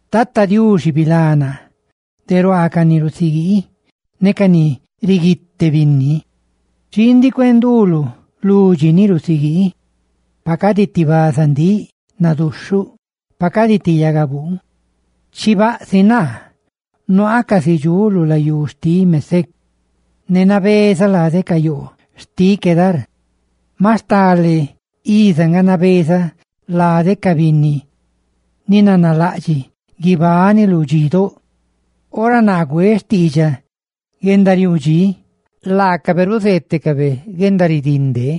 Tata Diuxi, bilá naa de ruaa ca ni rusiguii ne de ruaa ca ni riguite binni. Xii ndiꞌ cuee nduluꞌ, ludxi ni rusiguii. ¡Pa cadi ti bazandíꞌ naduxhuꞌ! ¡Pa cadi ti ndaa baruusa ca gui! ¡Chibaꞌ si naa, nabezaꞌ casi dxuꞌ lu layú xtiꞌ Mésec, ne nabezaꞌ lade ca yoo lari xtiꞌ Quedar! Maꞌ stale iza nga nabezaꞌ lade ca binni ni nanalaꞌdxiꞌ guibani lu dxidóꞌ; ¡ora naa güeꞌ xtiidxaꞌ guendariuu dxí, laacabe ruzeetecabe guendaridinde!